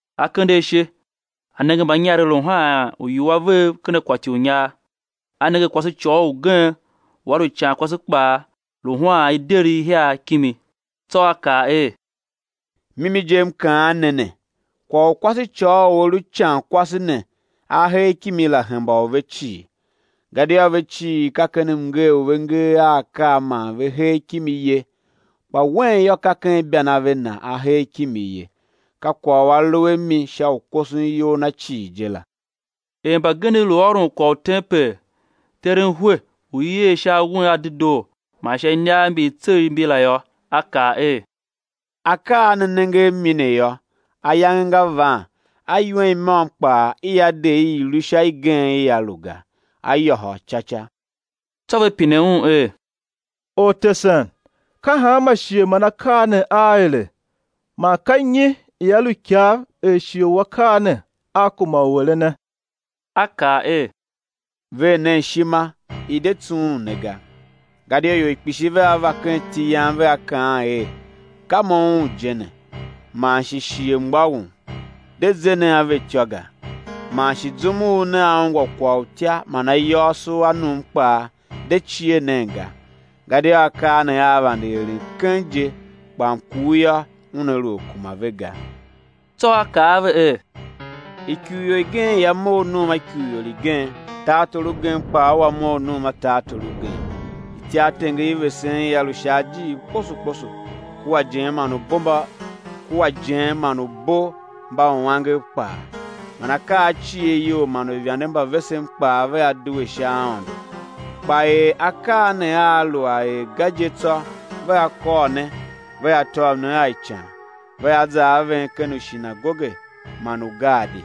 A kende ashe, a nenge mbanyarev lu haan uiwua vev ken akwati u inyar. A nenge kwasecôghol ugen u a lu icankwase kpaa lu haan ideri ihiar kimi. Tsô A kaa er: Mimi je M kaan ne ne, kwagh u kwasecôghol u a lu icankwase ne a hee kimi la, hemba u ve cii; gadia ve cii ka ken mngee u ve ngee a akaa man ve hee kimi ye, kpa wen yô, ka ken ibanave na a hee kimi ye, ka kwagh u a lu a mi sha u koson iyol na cii je la. Er mbagenev lu ôron kwagh u tempel, teren hwe u i er un sha awen a dedoo man sha iniav mbi i tsegh mbi la yô, A kaa er: Akaa a ne nenge a mi ne yô, ayange nga van a iwen i môm kpaa i á de i i̱ lu sha igen ia lu ga, á yôhôl ca ca. Tsô ve pine Un er: Ortesen, ka hanma shighe man akaa ne aa ere, man ka nyi ia lu ikav er shighe u akaa ne aa kuma u erene? A kaa er: Ver nen ishima, i̱ de tsughun ne ga; gadia ior kpishi vea va ken iti Yam, vea kaan er: Ka mo Un je ne; man shi: Shighe mgbôghom; de ze nen a ve ityô ga. Man shi zum u nea ungwa kwagh u utya man ayôôso a num kpaa, de cie nen ga; gadia akaa ne aa vande eren keng je; kpa mkur yô, una lu a kuma ve ga. Tsô A kaa a ve er: Ikurior igen ia mough num a ikurior igen; tartor ugen kpaa ua mough num a tartor ugen. Ityartenger i vesen ia lu sha ajiir kposo kposo, kua ijen man ubombauangev kpaa; man akaa a cieryol man uivande mba vesen kpaa vea due sha aôndo. Kpa er akaa ne aa lu a er ga je tsô, vea kôr ne, vea tôv ne a ican, vea za a ven ken ushinagoge man ugaadi;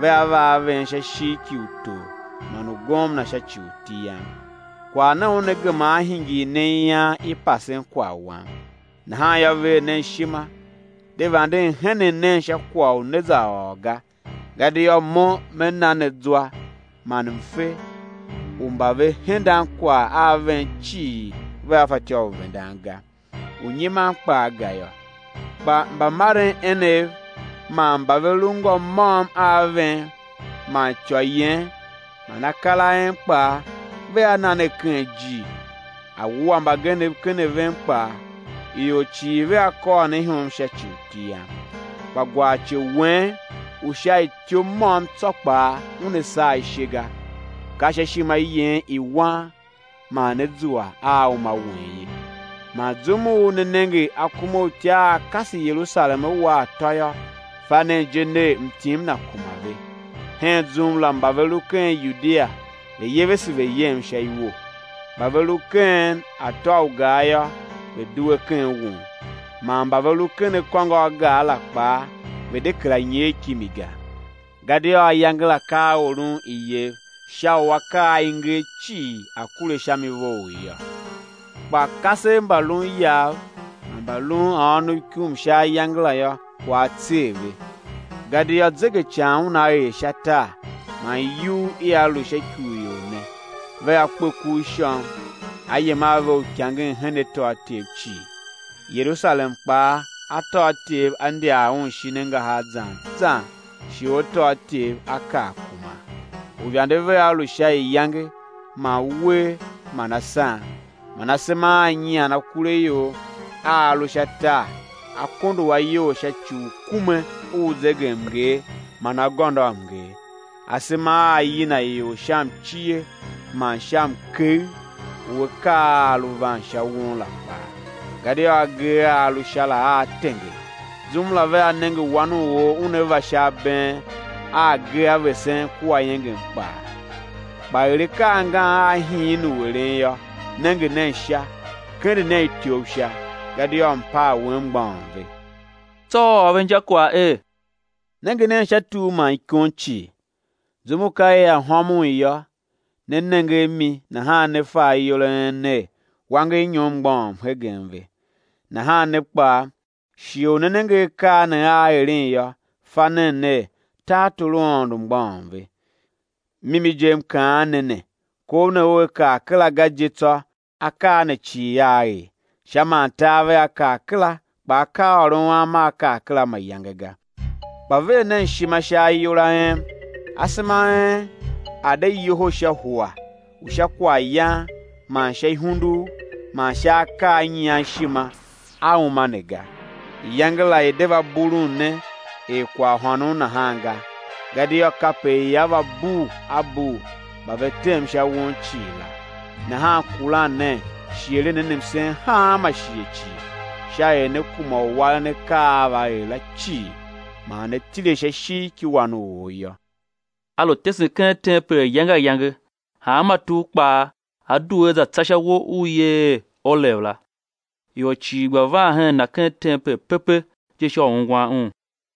vea va a ven sha ishigh ki utor man ugomna sha ci u iti Yam. Kwagh ne una gema á hingir ne ian i pasen kwagh Wam. Nahan yô, ver nen ishima, de vanden henen nen sha kwagh u né za ôr ga; gadia Mo Me na ne zwa man mfe u mba ve hendan kwagh a ven cii vea fatyô u vendan ga, u nyiman kpaa ga yô. Kpa mbamaren enev man mba ve lu ngô môm a ven man ityô yen man akar a en kpaa, vea na ne ken ijir, á wua mbagenev ken a ven kpaa. Ior cii vea kôr ne ihom sha ci u iti Yam. Kpa gwarce wen u sha ityou môm tsô kpaa una saa ishe ga. Ka sha ishima yen i wan man né zua a uma wen ye. Man zum u né nenge akumautya aa kase Yerusalem á wa atô yô, fa nen je ner, mtim na kuma ve. Hen zum la mba ve lu ken Yudia, ve̱ yevese ve̱ yem sha iwo; mba ve lu ken atô u gar yô, ve̱ due ken won; man mba ve lu ken akôngo a gar la kpaa ve̱ de kera nyer kimi ga; gadia ayange la ka a oron iyev sha u akaa a i nger cii a̱ kure sha mi vough yô. Kpa kasev mba lun iyav man mba lun a ônov sha ikum sha ayange la yô, kwagh á tser ve gadia zegecan una er sha tar, man iyugh ia lu sha ikurior ne. Vea kpe ku u ishôm; á yem a ve uikangen hen atôatyev cii; Yerusalem kpaa atôatyev á ndyar un shin angahar zan zan shighe u atôatyev á kar kuman. Uivande vea lu sha iyange man uwer man asan, man asema aa nyian akuraior a a lu sha tar á kondo a iyol sha ci u kume u zegemnger man agôndoamnger; asema aa yina ior sha mcie man sha mkegh u akaa a a lu van sha won la kpaa; gadia agee a a lu Sha la aa tenger. Zum la vea nenge Wan u or Una va sha abeen, a agee a vesen kua iengem kpaa. Kpa er akaa angan aa hiin u eren yô, nenge nen sha, kende nen ityouv sha, gadia mpaa wen mgbôghom ve. Tsô A ôr ve injakwagh er: Nenge nen sha tur man ikon cii, zum u ka ia hômon yô, ne nenge a mi, nahan ne fa ayol a en ner, wangernyom mgbôghom hegen ve. Nahan ne kpaa, shighe u né nenge akaa ne aa eren yô, fa nen ner, tartor u Aôndo mgbôghom ve. Mimi je, m kaan ne ne, kov ne ua kar kera ga je tsô akaa ne cii aa er. Sha man tar vea kar kera, kpa akaaôron Am aa kar kera mayange ga. Kpa ver nen ishima sha ayol a en, asema a en a̱ de yoho sha hua u sha kwaghyan man sha ihundugh man sha akaa a nyian ishima a uma ne ga, iyange la i̱ de va bulun ne er kwaghhônon nahan ga; gadia kape ia va bul a bul mba ve tem sha won cii la. Nahan kuran nen shi eren nen msen hanma shighe cii, sha er né kuma u waren akaa a á va er la cii, man né tile sha ishigh ki Wan u or yô. A lu tesen ken tempel ayange ayange; hanma tugh kpaa A due A za tsa sha uwo u i yer er Olev la. Ior cii gba van hen Na ken tempel pepe je sha u ungwan Un.